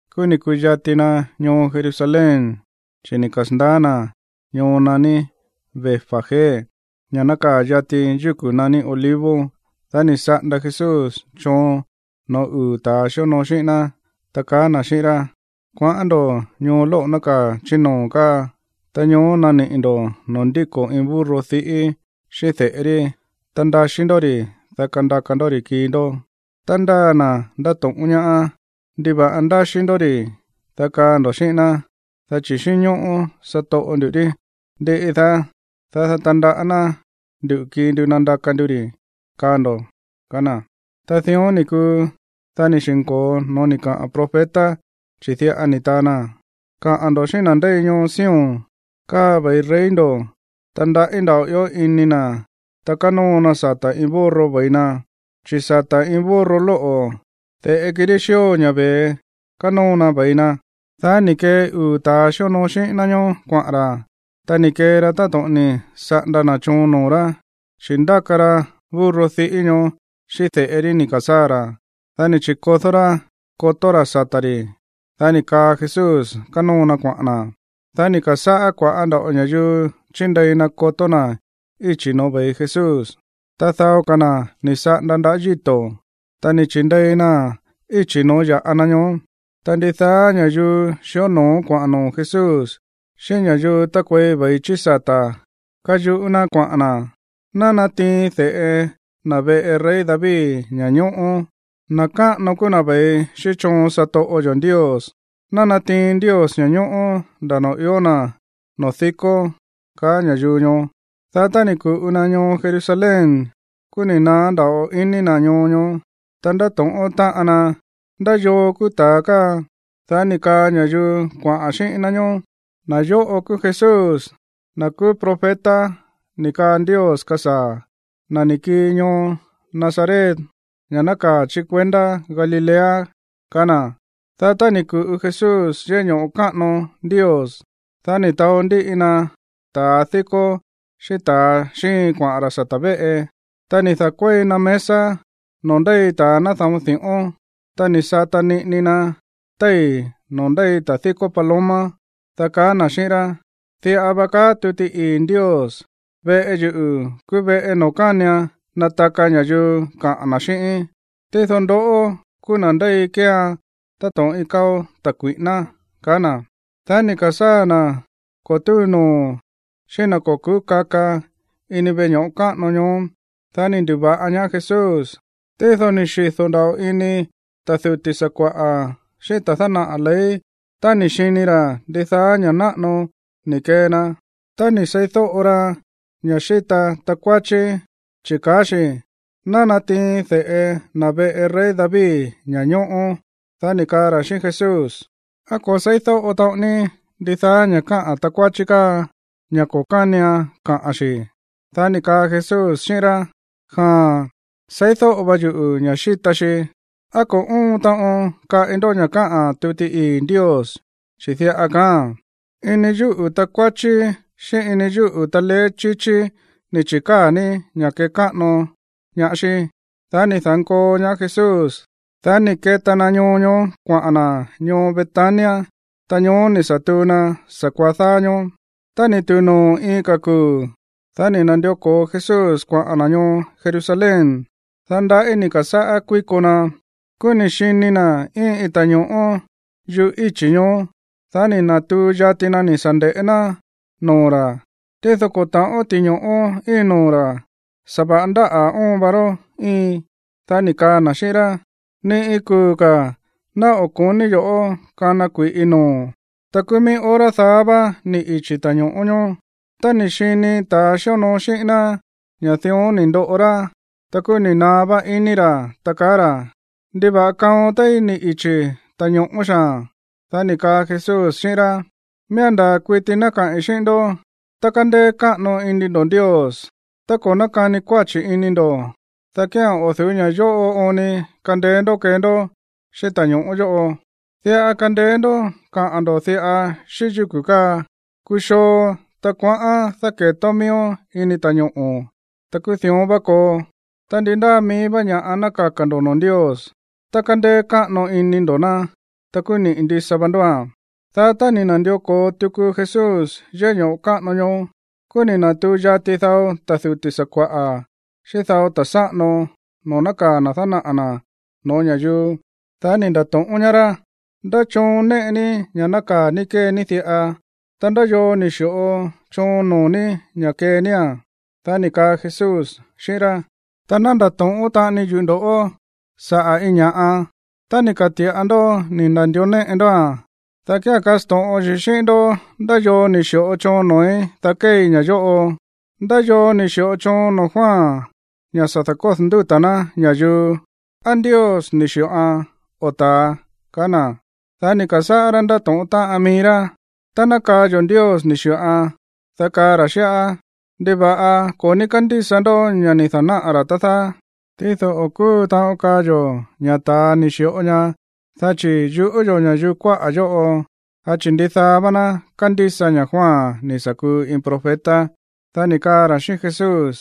Kúú ni̱ ku̱yati na ñoo Jerusalén, chi̱ ni̱ kasa̱ndaá na̱ ñoo naní Betfagé, ña̱ nákaa̱ yati yúku̱ naní Olivos. Dá ni̱ saꞌanda Jesús choon no̱ó uu̱ ta̱a xíonoo xíꞌín ná, ta kaá na̱ xíꞌín rá: ―Kuaꞌán ndo̱ ñoo lóꞌo̱ nákaa̱ chí noo̱ káa. Ta ñoó naniꞌi̱ ndo̱ noo̱ ndíko̱ iin burro diꞌí xíꞌín de̱ꞌe rí. Ta ndaxí ndó ri̱, dá kandaka ndó ri̱ kii ndó. Tá ndáa na̱ ndato̱ꞌón ñaá: “¿Ndiva̱ꞌa ndaxí ndó ri̱?”, dá kaa ndo̱ xíꞌín ná. “Dá chi̱ xínñóꞌó satoꞌo ndu̱ rí. Ndiꞌi daá, dá ná tandaꞌá ná ndu̱ kii ndu nandaka ndu ri̱”, kaa ndo̱ ―kaá na̱. Ta dión ni̱ kuu, dá ni̱ xi̱nko̱o no̱ó ni̱ kaꞌa̱n profeta, chi̱ diꞌa ni̱ taa na: Kaꞌa̱n ndo̱ xíꞌín na̱ ndéi ñoo Sión, “Káa ve̱i rey ndo̱, ta ndaꞌí nda̱ꞌo ió ini na̱, ta kánóo na sata̱ iin burro ve̱i na, chi̱ sata̱ iin burro lóꞌo̱, de̱ꞌe kirí xío ña̱ ve̱e, kánóo na ve̱i na.” Dá ni̱ kee uu̱ ta̱ xíonoo xíꞌín ná ñoó kuaꞌa̱n ra̱. Ta ni̱ kee ra táto̱ꞌon ni̱ saꞌanda na̱ choon noo̱ rá, chi̱ ndáka ra burro diꞌí ñoó xíꞌín de̱ꞌe rí ni̱ ka̱sáa̱ ra̱. Dá ni̱ chi̱kodó rá kotó ra̱ sata̱ ri̱. Dá ni̱ kaa Jesús kánóo na kuaꞌa̱n na̱. Dá ni̱ ka̱sáꞌá kua̱ꞌá nda̱ꞌo ña̱yuu chindei na kotó na̱ íchi̱ no̱ó ve̱i Jesús, ta dao ka̱ na̱ ni̱ saꞌanda ndaꞌá yíto̱, ta ni̱ chi̱ndei naa̱n íchi̱ noo̱ ya̱ꞌa na ñoó. Ta ndidaá ña̱yuu xió no̱ó kuaꞌa̱n noo̱ Jesús xíꞌín ña̱yuu tákuei ve̱i chí sata̱ káyuꞌú ná kuaꞌa̱n na̱: ―¡Ná natiin de̱ꞌe na̱ veꞌe rey David ña̱ñóꞌó! ¡Na̱ káꞌano kúú na̱ ve̱i xíꞌín choon satoꞌo yo̱ Ndios! Ná natiin Ndios ña̱ñóꞌó nda̱ noo̱ ió na̱ noo̱ dikó ―kaá ña̱yuu ñoó. Dá tá ni̱ ku̱ꞌu na ñoo Jerusalén, kúú ni̱ naá nda̱ꞌo ini na̱ ñoo ñoó, ta ndáto̱ꞌón táꞌan na: ―¿Ndá yoo kúú ta̱a káa? Dá ni̱ kaa ña̱yuu kuaꞌa̱n xíꞌín ná ñoó: ―Na̱ yóꞌo kúú Jesús, na̱ kúú profeta ni̱ kaa Ndios kasaa̱, na̱ ni̱ kii ñoo Nazaret, ña̱ nákaa̱ chí kuendá Galilea ―kaá na̱. Dá tá ni̱ ku̱ꞌu Jesús yéꞌé ño̱ꞌo káꞌano Ndios, dá ni̱ taó ndíꞌi na ta̱ díkó xíꞌín ta̱ xíin kuaꞌa̱n ra̱ sata̱ véꞌe. Ta ni̱ da̱kuéi na mesa noo̱ ndéi ta̱a náda̱on di̱ꞌón. Ta ni̱ sata niꞌini na téi̱ noo̱ ndéi ta̱ díkó paloma. Dá kaá na̱ xíꞌín rá: ―Diꞌa va kaá tuti ii̱ Ndios: “Veꞌe yuꞌu̱ kúú veꞌe noo̱ kánian nataka ña̱yuu kaꞌa̱n na̱ xíꞌíín.” Tído ndoꞌó kúú na̱ ndéi kéean táto̱ꞌon iin káo̱ ta̱ kui̱ꞌíná ―kaá na̱. Dá ni̱ ka̱sáa̱ na̱ ko̱ túu noo̱ xíꞌín na̱ ko̱ ku̱ú kaka ini veꞌe ño̱ꞌo káꞌano ñoó. Dá ni̱ ndu̱va̱ꞌa ñaá Jesús. Tído ni̱ xido̱ nda̱ꞌo ini ta̱ duti̱ sakua̱ꞌa̱ xíꞌín ta̱ dánaꞌa̱ ley tá ni̱ xini ra̱ ndidaá ña̱ náꞌano ni̱ kee na, ta ni̱ seídóꞌo ra ña̱ xíta takuáchí, chi̱ kaá xi̱: “Ná natiin de̱ꞌe na̱ veꞌe rey David ña̱ñóꞌó.” Dá ni̱ kaa ra̱ xíꞌín Jesús: ―¿Á ko̱ se̱ídóꞌo taꞌon ní ndidaá ña̱ káꞌa̱n takuáchí káa, ña̱ ko̱ kánian kaꞌa̱n xi̱? Dá ni̱ kaa Jesús xíꞌín rá: ―Jaa̱n, seídóꞌo va yuꞌu̱ ña̱ xíta xi. ¿Á ko̱ óon taꞌon kaꞌi ndó ña̱ káꞌa̱n tuti ii̱ Ndios? Chi̱ diꞌa kaáa̱n: Ini yúꞌu̱ takuáchí xíꞌín ini yúꞌu̱ taleé chíchí ni̱ chi̱káa̱ ní ña̱ kékáꞌano ñaá xí. Dá ni̱ da̱nkoo ñaá Jesús. Dá ni̱ keta na ñoo ñoó kuaꞌa̱n na̱ ñoo Betania. Ta ñoó ni̱ sa̱ tuu na sa̱kuaá dáá ñóó. Tá ni̱ tu̱u noo̱ iin ka̱ kuu̱, dá ni̱ na̱ndió ko̱o Jesús kuaꞌa̱n na̱ ñoo Jerusalén. Dá ndaꞌí ni̱ ka̱sáꞌá kuíko na. Kúú ni̱ xini na̱ íin iin ta̱ño̱ꞌó yuꞌú íchi̱ ñoó. Dá ni̱ na̱tuu yati na ni̱ sa̱ nde̱ꞌé ná noo̱ ra̱, tído ko̱ ta̱ꞌón ti̱ño̱ꞌó íin noo̱ ra̱. Sa̱va̱ꞌa ndáꞌa̱ óon va rá íin. Dá ni̱ kaa na̱ xíꞌín rá: ―¡Ni iin kuu̱ ka̱ ná o̱ ko̱ní yo̱ꞌó kana kui̱ꞌi noo̱o̱n! Ta kúú mií hora daá vá ni̱ ichi̱ ta̱ño̱ꞌó ñoó. Tá ni̱ xini ta̱a xíonoo xíꞌín ná ña̱ dión ni̱ ndoꞌo rá, ta kúú ni̱ naá vá iní ra̱, ta kaá ra̱: ―¿Ndiva̱ꞌa kaon téí ni̱ ichi̱ ta̱ño̱ꞌó xaa̱n? Dá ni̱ kaa Jesús xíꞌín rá: ―Miía̱n ndaa̱ kuiti ná kaꞌi̱n xíꞌín ndó, tá kándéé káꞌano ini ndo̱ Ndios, ta ko̱ nákani kuáchi̱ ini ndo̱, dá kía̱n o̱ du̱ú ña̱ yóꞌo oon ni kandeé ndó kee ndó xíꞌín ta̱ño̱ꞌó yóꞌo. Diꞌa kandeé ndó kaꞌa̱n ndo̱ diꞌa xíꞌín yúku̱ káa: “¡Kuxoo, ta kuaꞌán dáke̱tón miíón ini ta̱ñoꞌo̱!” Ta kúú dión vá koo. Ta ndi ndáa mií vá ña̱ꞌa ná kaka̱ ndo̱ noo̱ Ndios, tá kándéé káꞌano ini ndo̱ ná, ta kúú niꞌi̱ ndisa va ndóa̱n. Dá tá ni̱ na̱ndió ko̱o tuku Jesús yéꞌé ño̱ꞌo káꞌano ñoó, kúú ni̱ na̱tuu yati dao ta̱ duti̱ sakua̱ꞌa̱ xíꞌín dao ta̱ sáꞌano noo̱ nákaa̱ na̱ dánaꞌa̱ na̱ no̱ó ña̱yuu. Dá ni̱ nda̱to̱ꞌón ñaá rá: ―¿Ndá choon néꞌe ní ña̱ nákaa̱ ní kée ní diꞌa? Ta, ¿ndá yoo ni̱ xi̱ꞌo choon noo̱ ní ña̱ kée nía̱n? Dá ni̱ kaa Jesús xíꞌín rá: ―Ta ná ndato̱ꞌón taꞌani yuꞌu̱ ndo̱ꞌó saꞌa̱ iin ña̱ꞌa. Tá ni̱ ka̱ti̱ꞌa ndó ni̱ na̱ndió néꞌe ndóa̱n, dá kía̱n kasto̱ꞌon yuꞌu̱ xíꞌín ndó ndá yoo ni̱ xi̱ꞌo choon noo̱í, dá kéei ña̱ yóꞌo. ¿Ndá yoo ni̱ xi̱ꞌo choon noo̱ Juan ña̱ sa̱ da̱kódo̱ ndúta̱ ná ña̱yuu? ¿Á Ndios ni̱ xi̱ꞌoan o ta̱a? ―kaá na̱. Dá ni̱ ka̱sáꞌá rá ndátóꞌón táꞌan mií rá: ―Tá ná kaa yo̱ ña̱ Ndios ni̱ xi̱ꞌoan, dá kaa ra̱ xíꞌá: “¿Ndiva̱ꞌa ko̱ ní kándísa ndó ña̱ ni̱ da̱náꞌa̱ ra̱, tá dáá?” Tído o̱ kúu taꞌon kaa yo̱ ña̱ ta̱a ni̱ xi̱ꞌo ña, dá chi̱ yuꞌú yo̱ ña̱yuu kuáꞌa̱ yóꞌo, dá chi̱ ndidaá vá ná kándísa ña̱ Juan ni̱ sa̱ kuu iin profeta. Dá ni̱ kaá ra̱ xíꞌín Jesús: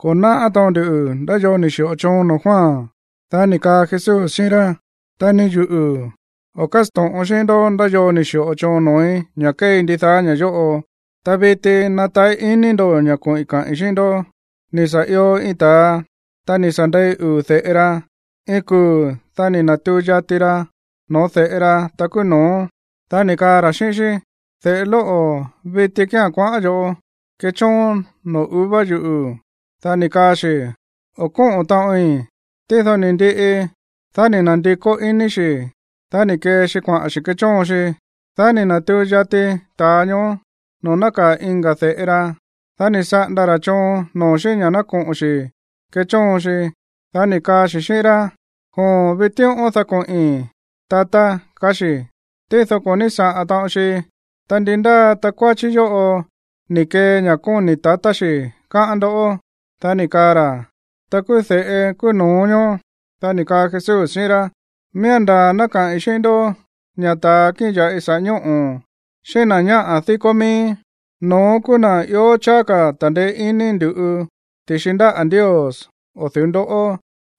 ―Ko̱ náꞌá taꞌon ndu ndá yoo ni̱ xi̱ꞌo choon noo̱ Juan. Dá ni̱ kaa Jesús xíꞌín rá: ―Ta ni yuꞌu̱ o̱ kásto̱ꞌon xíꞌín ndó ndá yoo ni̱ xi̱ꞌo choon noo̱í ña̱ kéei ndidaá ña̱ yóꞌo. ’Ta viti nataꞌí iní ndo̱ ña̱ koꞌi̱n kaꞌi̱n xíꞌín ndó. Ni̱ sa̱ io iin ta̱a, ta ni̱ sa̱ ndei uu̱ de̱ꞌe ra. Iin kuu̱, dá ni̱ na̱tuu yati ra no̱ó de̱ꞌe ra, ta kúú no̱ó, dá ni̱ kaa ra̱ xíꞌín xí: “De̱ꞌe lóꞌo̱, viti kía̱n kuaꞌán yo̱ꞌó kechóon noo̱ uva yuꞌu̱.” Dá ni̱ kaa xi̱: “O̱ kóꞌo̱n taꞌoin.” Tído ni̱ ndiꞌi, dá ni̱ na̱ndikó iní xi̱. Dá ni̱ kee xi kuaꞌa̱n xi̱ kechóon xi. Dá ni̱ na̱tuu yati ta̱a ñoó noo̱ nákaa̱ iin ka̱ de̱ꞌe ra, dá ni̱ saꞌanda ra̱ choon noo̱ xí ña̱ ná koꞌo̱n xi̱ kechóon xi. Dá ni̱ kaa xi̱ xíꞌín rá: “Joon, vitíꞌón dá koꞌi̱n, tatá”, kaá xi̱. Tído ko̱ ní saꞌa̱n taꞌon xi. Ta, ¿ndi ndáa takuáchí yóꞌo ni̱ kee ña̱ kóni̱ tatá xi̱, káꞌán ndoꞌó? Dá ni̱ kaa ra̱: ―Ta kúú de̱ꞌe kúú no̱ó ñoó. Dá ni̱ kaa Jesús xíꞌín rá: ―Miía̱n ndaa̱ ná kaꞌi̱n xíꞌín ndó ña̱ ta̱ kíꞌin ya̱ꞌi saꞌa̱ ñóꞌo̱, xíꞌín na̱ ñáꞌa̱ díkó mií, no̱ón kúú na̱ ió cháá ka̱ ta̱ndeé iní ndu̱ꞌu ti̱xi ndáꞌa̱ Ndios o̱ du̱ú ndoꞌó.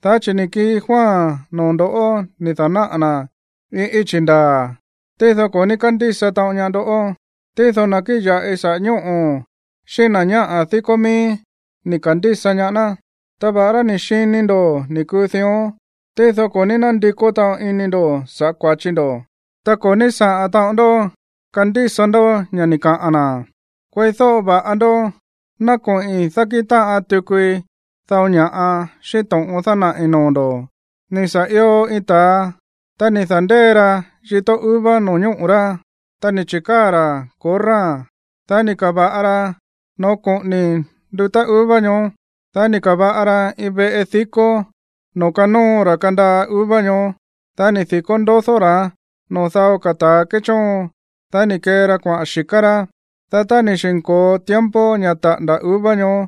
Dá chi̱ ni̱ kii Juan noo̱ ndo̱ꞌó ni̱ da̱náꞌa̱ na̱ iin íchi̱ ndaa̱, tído ko̱ ní kándísa taꞌon ñaá ndó. Tído ta̱ kíꞌin ya̱ꞌi saꞌa̱ ñóꞌo̱ xíꞌín na̱ ñáꞌa̱ díkó mií ni̱ ka̱ndísa ñaá ná. Ta va̱ꞌará ni̱ xini ndo̱ ni̱ kuu dión, tído ko̱ ní nándikó taꞌon iní ndo̱ sa̱ꞌá kua̱chi ndo̱, ta ko̱ ní saꞌa̱n taꞌon ndó kandísa ndó ña̱ ni̱ kaꞌa̱n na̱. ’Kueídóꞌo va̱ꞌa ndó, ná koꞌi̱n dákíꞌin táꞌan tukui dao ña̱ꞌa xíꞌín to̱ꞌon dánaꞌi̱ noo̱ ndo̱. Ni̱ sa̱ io iin ta̱a, ta ni̱ da̱ndée ra yitó uva no̱ñóꞌo̱ rá. Ta ni̱ chi̱káa̱ ra̱ korráa̱n. Dá ni̱ ka̱va̱ꞌa ra noo̱ koꞌóní ndutá uva ñoó. Ta ni̱ ka̱va̱ꞌa ra iin veꞌe dikó noo̱ kanóo ra kandaa uva ñoó. Dá ni̱ di̱kó ndodó ra̱án noo̱ dao ka̱ ta̱a kéchóon. Dá ni̱ kee ra kuaꞌa̱n xi̱ká rá. Dá tá ni̱ xi̱nko̱o tiempo ña̱ taꞌa̱nda̱ uva ñoó,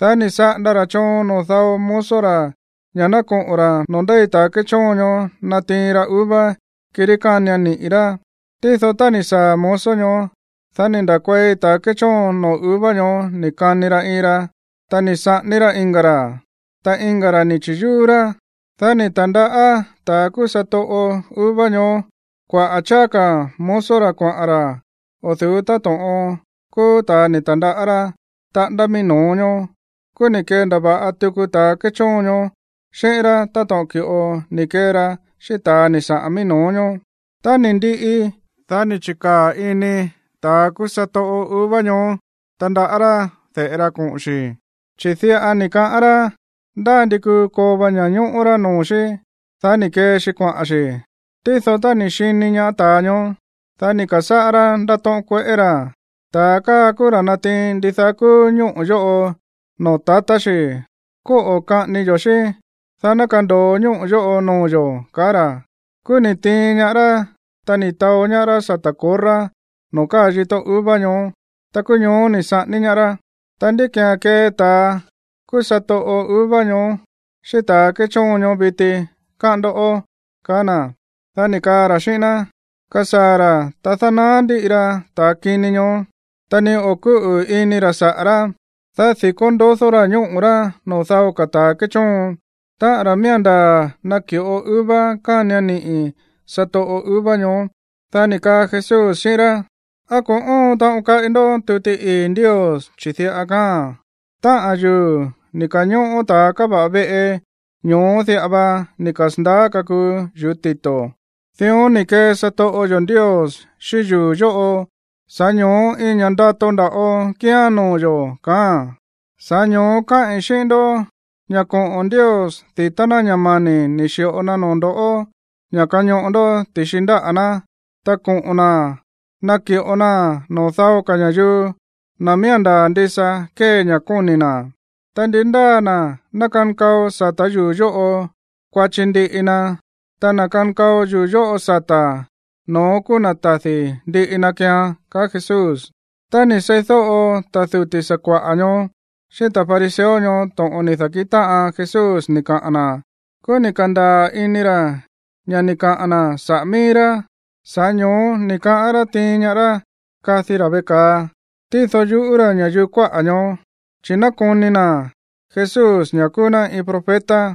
dá ni̱ saꞌanda ra̱ choon noo̱ dao mozo ra̱ ña̱ ná koꞌo̱n ra̱ noo̱ ndéi ta̱ kéchóon ñoó natiin ra uva, kirí kánian niꞌi̱ rá. Tído tá ni̱ saa̱ mozo ñoó, dá ni̱ nda̱kuei ta̱ kéchóon noo̱ uva ñoó ni̱ kani ra iin ra, ta ni̱ saꞌání rá iin ka̱ ra̱, ta iin ka̱ ra̱ ni̱ chi̱yúú rá. Dá ni̱ ta̱ndaꞌá ta̱ kúú satoꞌo uva ñoó kuaꞌa̱ cháá ka̱ mozo ra̱ kuaꞌa̱n ra̱ o̱ du̱ú táto̱ꞌon kúú ta̱ ni̱ ta̱ndaꞌá rá taꞌándá mií no̱ó ñoó. Kúú ni̱ kendava̱ꞌa tuku ta̱a kéchóon ñoó xíꞌín rá táto̱ꞌon ki̱ꞌo ni̱ kee ra xíꞌín ta̱ ni̱ saꞌa̱n mií no̱ó ñoó. Tá ni̱ ndiꞌi, dá ni̱ chi̱kaa̱ ini ta̱a kúú satoꞌo uva ñoó tandaꞌá rá de̱ꞌe ra koꞌo̱n xi̱, chi̱ diꞌa ni̱ kaꞌán rá: “Ndá ndi kuu koo va ña̱ñóꞌó rá noo̱ xí.” Dá ni̱ kee xi kuaꞌa̱n xi̱. Tído, tá ni̱ xini ñaá ta̱a ñoó, dá ni̱ ka̱sáꞌá rá ndátóꞌón kueꞌé ra̱: “Ta̱ káa kúú ra̱ natiin ndidaá kúú ñóꞌo̱ yóꞌo noo̱ tatá xi̱. Kóꞌo̱ kaꞌání yo̱ xí, dá ná kando̱o ñóꞌo̱ yóꞌo noo̱ yo̱”, kaá ra̱. Kúú ni̱ tiin ñaá rá, ta ni̱ taó ñaá rá sata̱ korrá noo̱ káa yitó uva ñoó. Ta kúú ñoó ni̱ saꞌání ñaá rá. Ta, ¿ndí ki̱án kee ta̱a kúú satoꞌo uva ñoó xíꞌín ta̱a kéchóon ñoó viti, káꞌán ndó? ―kaá na̱. Dá ni̱ kaa ra̱ xíꞌín ná: ―Kasaa̱ ra̱, ta dánaá ndíꞌi ra ta̱a kini ñoó, ta ni o̱ kúꞌu̱ ini ra̱ saꞌa̱ rá. Dá di̱kó ndodó ra̱ ñóꞌo̱ rá noo̱ dao ka̱ ta̱ kéchóon, táꞌa̱n ra̱ miía̱n ndaa̱ naki̱ꞌo uva kánian niꞌi̱ satoꞌo uva ñoó. Dá ni̱ kaa Jesús xíꞌín rá: ―¿Á ko̱ óon taꞌon kaꞌi ndó tuti ii̱ Ndios? Chi̱ diꞌa kaáa̱n: Táꞌa̱n yuu̱ ni̱ ka̱ñóꞌó ta̱a káva̱ꞌa veꞌe, ñoó diꞌa va ni̱ kasa̱ndaá kakuu yuu̱ tito̱. Dión ni̱ kee satoꞌo yo̱ Ndios xíꞌín yuu̱ yóꞌo, sa̱ꞌá ño̱ó iin ña̱ꞌa ndato nda̱ꞌo kíán noo̱ yo̱, kaáa̱n. Sa̱ꞌá ño̱ó káꞌi̱n xíꞌín ndó ña̱ koꞌo̱n Ndios di̱tá ná ña̱ mani̱ ni̱ xi̱ꞌo na noo̱ ndo̱ ña̱ kañoꞌo ndó ti̱xi ndáꞌa̱ ná, ta koꞌo̱n na̱ naki̱ꞌo naa̱n noo̱ dao ka̱ ña̱yuu, na̱ miía̱n ndaa̱ ndisa kee ña̱ kóni̱ na̱. Tá ndi ndáa na̱ ná kankao sata̱ yuu̱ yóꞌo, kuachi ndiꞌi na. Ta na̱ kankao yuu̱ yóꞌo sata̱, no̱ón kúú na̱ tadi̱ ndiꞌi na keean ―kaá Jesús. Tá ni̱ seídóꞌo ta̱ duti̱ sakua̱ꞌa̱ ñoó xíꞌín ta̱ fariseo ñoó to̱ꞌon ni̱ da̱kíꞌin táꞌan Jesús ni̱ kaꞌa̱n na̱, kúú ni̱ ka̱ndaa̱ ini ra̱ ña̱ ni̱ kaꞌa̱n na̱ saꞌa̱ míí rá. Sa̱ꞌá ño̱ó ni̱ kaꞌán rá tiin ñaá rá kadi ra̱ veꞌe ka̱a, tído yuꞌú ra̱ ña̱yuu kuáꞌa̱ ñoó, chi̱ nákoni na̱ Jesús ña̱ kúú ná iin profeta.